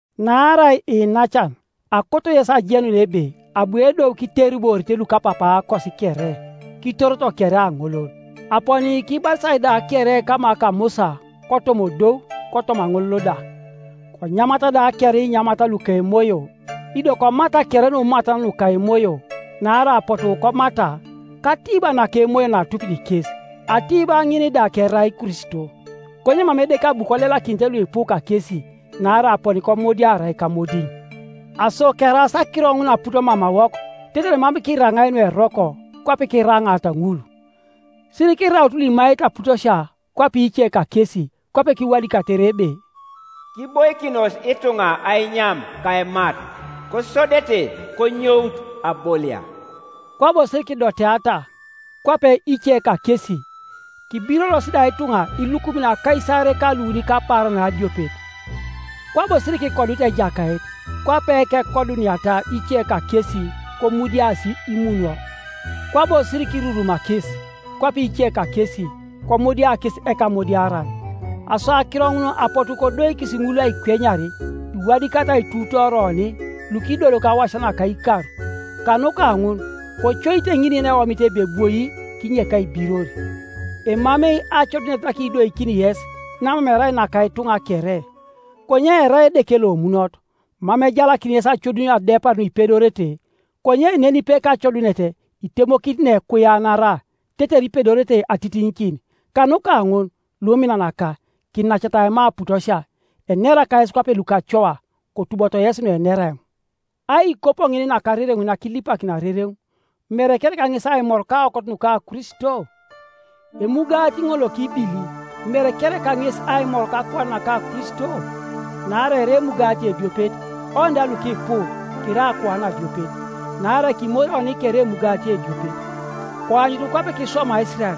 Naarai iinacan, akoto yes ajenun ebe abu edou kiteriborite lukapapaakos kere, kitoroto kere aŋolol, aponi kibatisai da kere kama ka Musa kotoma odou kotoma aŋolol da, konyamata da kere inyamat luka emoyo, ido komata kere numatan nuka emoyo. Naarai apotu komata kAtiiba naka emoyo naatupit kes, Atiiba ŋin da kerai Kristo. Konye mam Edeke abu kolelakinite luipu kakesi; naarai aponi komudiarai kamodiŋ. Aso keraas akiro ŋun aput mamawok, tetere mam kiraŋai nueroko, kwape kiraŋaata ŋul. Sirikiraut luimaete aputosia, kwape ice kakesi; kwape kiwadikatere ebe, “Kiboikinos ituŋa ainyam ka aimat, kosodete konyout abolia.” Kwabo sirikidoteata, kwape ice kakesi, kibiroros da ituŋa ilukumin akaisaarei ka luuni kapaaran adiopet. Kwabo sirikikodut Ejakait, kwape kekoduniata ice kakesi, komudiasi imunwo. Kwabo sirikirurumakis, kwape ice kakesi, komudia kes Ekamudiaran. Aso akiro ŋun apotu kodoikis ŋul aikwenyar, iwadikatai aituutooria oni, lukidoloki awasia naka ikar. Kanuka ŋun kocoite ŋin yeneomit ebe ebwoi, kinyek aibiror. Emamei acodunet nakidoikini yes, namam erai naka ituŋa kere. Konye erai Edeke lomunot, mam ejalakini yes acodunio adepar nuipedorete, konye nenipe kacodunet itemokini neekuianara, tetere ipedorete atitiŋikin. Kanuka ŋun, luminanaka, kinacata aima aputosia. Enera kayes kwape lukacoa; kotuboto yesi nuenera eoŋ. Aikopo ŋin nakarereŋ nakilipakini arereŋ, mere kereka ŋes aimor kaokot nuka Kristo? Emugati ŋol lokibili, mere kereka ŋes aimor kakuan naka Kristo? Naarai erai emugati ediopet, oni da lukipu, kirai akuan adiopet, naarai kimori oni kere emugati ediopet. Koanyutu kwape kiswamaa Isirael;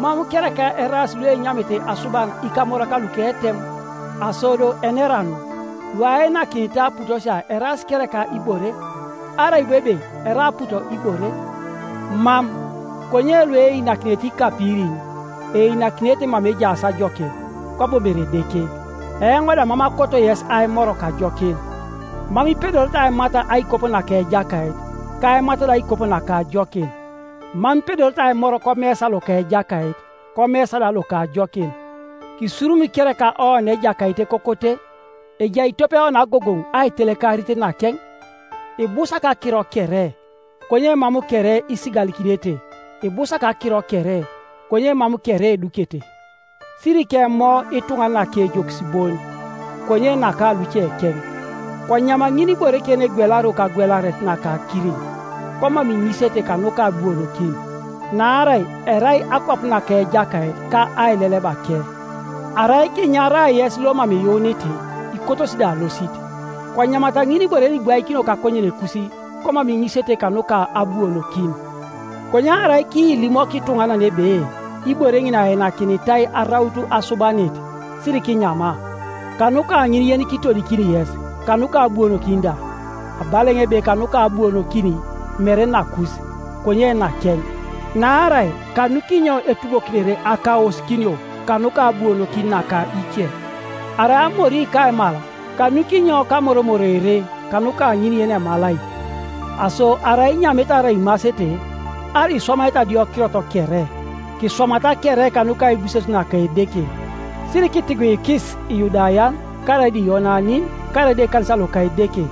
mam kereka eraas luenyamete asuban ikamorak luka etem? Aso do enera anu? Luainakinitai aputosia eraas kereka ibore? Arai bo ebe erai aput ibore? Mam, konye lueinakinete ikapirin, einakinete mama ejaas ajokin, kwabo mere Edeke. Eoŋ da mam akoto yes aimor kajokin. Mam ipedorete aimat aikopo naka Ejakait, ka aimat da aikopo naka ajokin. Mam ipedorete aimor komesa loka Ejakait, komesa da loka ajokin. Kisurumikereka oni Ejakait ekokote? Ejai tope oni agogoŋ aitelekarit nakeŋ? “Ibusak akiro kere,” konye mam kere isigalikinete. “Ibusak akiro kere,” konye mam kere edukete. Sirikemo ituŋanan akejokis bon, konye naka lucekeŋ. Konyam ŋinibore kere yenegwelario kagwelaret naka akiriŋ, komam iŋisete kanuka abuonokin. Naarai “erai akwap naka Ejakait, ka ailelebake.” Arai kiinyara yes lomam iyuunit, ikotosi da alosit, konyamata ŋinibore yenibwaikinio kakonyenekus, komam iŋisete kanuka abuonokin. Konye arai kiilimok ituŋanan ebe, “Ibore ŋin ainakinitai araut asubanit,” sirikinyama, kanuka ŋin yenikiitodikini yes, kanuka abuonokin da— abala eoŋ ebe kanuka abuonokin, mere nakus, konye nakeŋ. Naarai kanukinyo etubokinere akaosikinio kanuka abuonokin naka ice? Arai amori kaimal, kanukinyo kamoromoroere kanuka ŋin yenemalai? Aso arai inyamete arai imasete, arai iswamaete adiokirot kere, kiswamata kere kanuka aibuses naka Edeke. Sirikitiguikis Iyudayan, karaida Iyonanin, karaida ekanisa loka Edeke,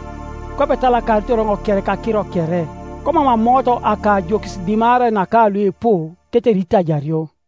kwape etalakaritor eoŋ kere kakiro kere, komam amoot akajokis dimarai naka luipu, tetere itajario.